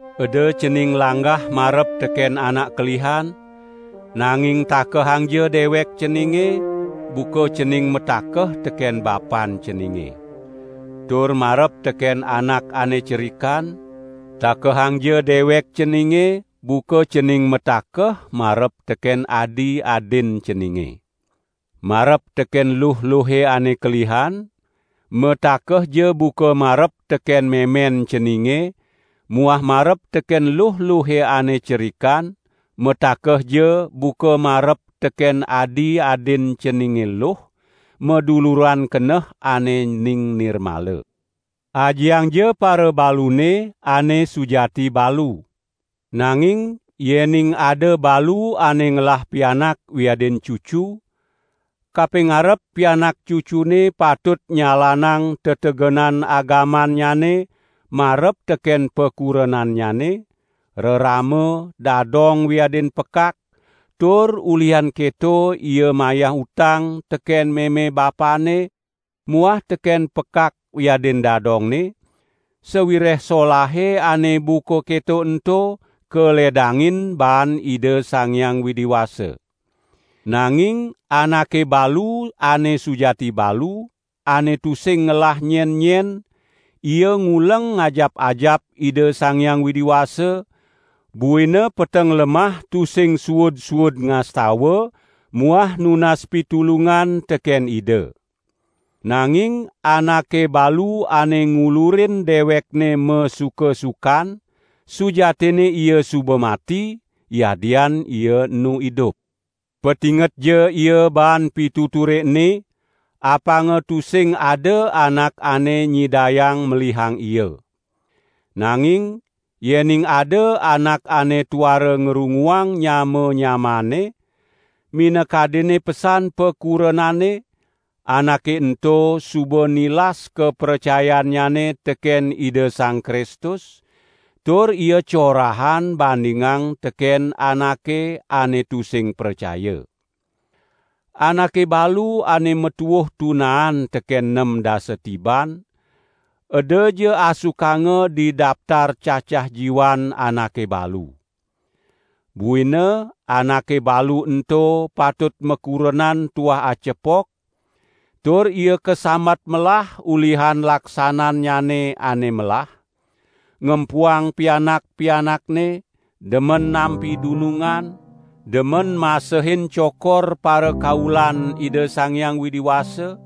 Eda cening langgah marep teken anak kelihan, nanging takehangja dewek ceninge buka cening matakeh teken bapan ceninge. Tur marep teken anak ane cerikan, takehangja dewek ceninge buka cening matakeh marep teken adi-adin ceninge. Marep teken luh-luhe ane kelihan, matakehja buka marep teken memen ceninge muah marep teken luh-luhe ane cerikan matakehja buka marep teken adi-adin ceninge luh, maduluran keneh ane ning nirmala. Ajiangja parabalune ane sujati balu. Nanging yening ada balu ane ngelah pianak wiadin cucu, kapingarep pianak cucunne patut nyalanang tetegenan agamannyane marep teken pakurenannyane, rerama, dadong wiadin pekak, tur ulihan keto ia mayah utang teken meme bapanne muah teken pekak wiadin dadongne, sawireh solahe ane buka keto ento kaledangin baan Ida Sang Hyang Widi Wasa. Nanging anake balu ane sujati balu, ane tusing ngelah nyen-nyen ia nguleng ngajap-ajap Ida Sang Hyang Widi Wasa, buina peteng lemah tusing suud-suud ngastawa muah nunas pitulungan teken Ida. Nanging anake balu ane ngulurin dewekne masuka-sukan sujatinne ia suba mati, yadian ia enu idup. Patingetja ia baan pituture ene, apanga tusing ada anak ane nyidayang melihang ia. Nanging yening ada anak ane tuara ngrunguang nyama-nyamaanne, minakadinne pesan pakurenanne, anake ento suba nilas kapracayannyane teken Ida Sang Kristus, tur ia corahan bandingang teken anake ane tusing pracaya. Anake balu ane matuuh tunaan teken nem dasa tiban, edaja asukanga di daptar cacah jiwan anake balu. Buina anake balu ento patut makurenan tuah acepok, tur ia kasambat melah ulihan laksanannyane ane melah: ngempuang pianak-pianakne, demen nampi dunungan, demen masehin cokor parakaulan Ida Sang Hyang Widi Wasa,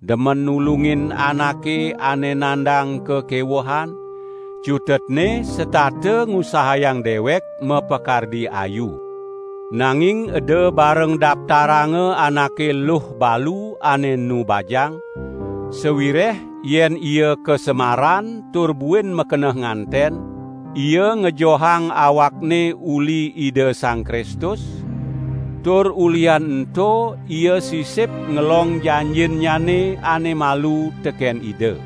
demen nulungin anake ane nandang kakewehan, cutetne setata ngusahayang dewek mapakardi ayu. Nanging eda bareng daptaranga anake luh balu ane enu bajang; sawireh yen ia kasemaran tur buin makeneh nganten, ia ngejohang awakne uli Ida Sang Kristus; tur ulihan ento ia sisip ngelong janjinnyane ane malu teken Ida.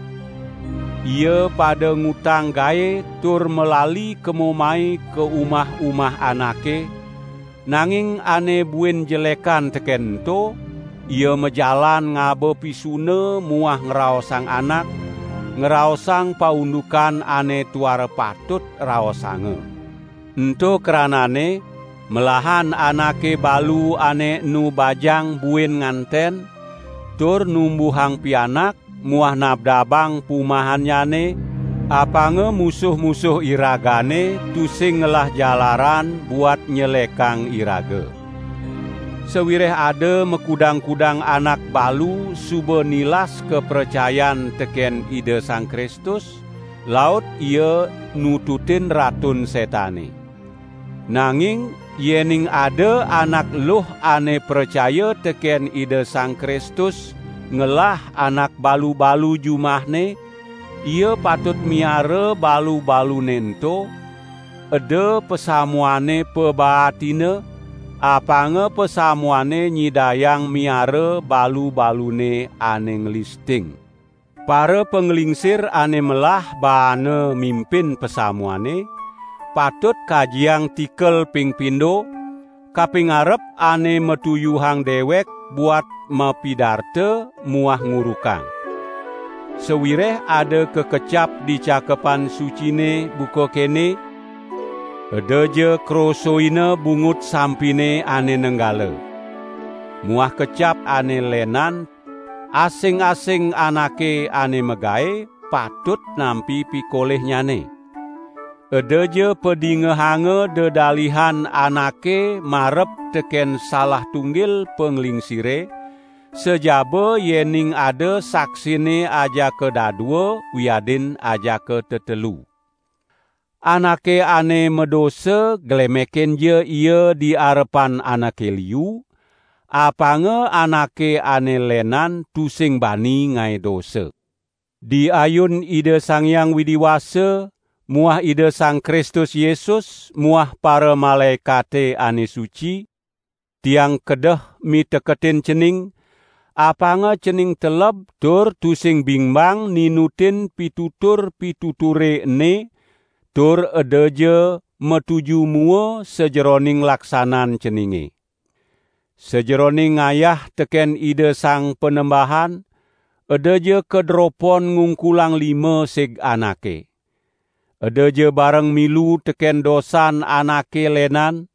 Ia pada ngutang gae tur malali kemo mai ka umah-umah anake, nanging ane buin jelekan teken ento, ia majalan ngaba pisuna muah ngraosang anak, ngraosang paundukan ane tuara patut raosanga. Ento krananne melahan anake balu ane enu bajang buin nganten, tur numbuhang pianak muah nabdabang pumahannyane, apanga musuh-musuh iragane tusing ngelah jalaran buat nyelekang iraga. Sawireh ada makudang-kudang anak balu suba nilas kapracayan teken Ida Sang Kristus, laut ia nututin Ratun Setane. Nanging yening ada anak luh ane pracaya teken Ida Sang Kristus ngelah anak balu-balu jumahne, ia patut miara balu-balune ento, eda pasamuane pabaatina, apanga pasamuane nyidayang miara balu-balune ane nglisting. Parapanglingsir ane melah baane mimpin pasamuane, patut kajiang tikel ping pindo, kapingarep ane matuyuhang dewek buat mapidarta muah ngurukang. Sawireh ada kakecap di Cakepan Sucine buka kene: "Edaja krosoina bungut sampine ane nenggala", muah kecap ane lenan: "Asing-asing anake ane magae patut nampi pikolihnyane". Edaja padingehanga dedalihan anake marep teken salah tunggil panglingsire, sajaba yening ada saksinne ajaka dadua wiadin ajaka tetelu. Anake ane madosa glemekinja ia di arepan anake liu, apanga anake ane lenan tusing bani ngae dosa. Di ayun Ida Sang Hyang Widi Wasa muah Ida Sang Kristus Yesus muah paramalaekate ane suci, tiang kedeh miteketin cening, apanga cening teleb tur tusing bingbang ninutin pitutur-pituture ene tur edaja matuju mua sajeroning laksanan ceninge. Sajeroning ngayah teken Ida Sang Panembahan edaja kadropon ngungkulang lima sig anake. Edaja bareng milu teken dosan anake lenan;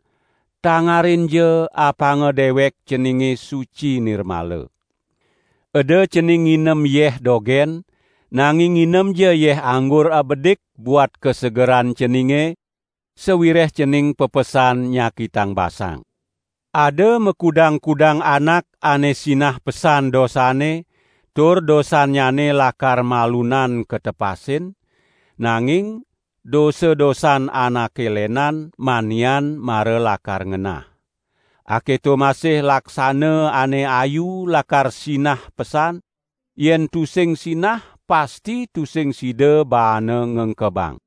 tangarinja apanga dewek ceninge suci nirmala. Eda cening nginem yeh dogen, nanging nginemja yeh anggur abedik buat kasegeran ceninge, sawireh cening pepesan nyakitang basang. Ada makudang-kudang anak ane sinah pesan dosanne tur dosannyane lakar malunan katepasin; nanging dosa-dosan anake lenan, manian mara lakar ngenah. Aketo masih laksana ane ayu lakar sinah pesan, yen tusing sinah pasti tusing sida baana ngengkebang.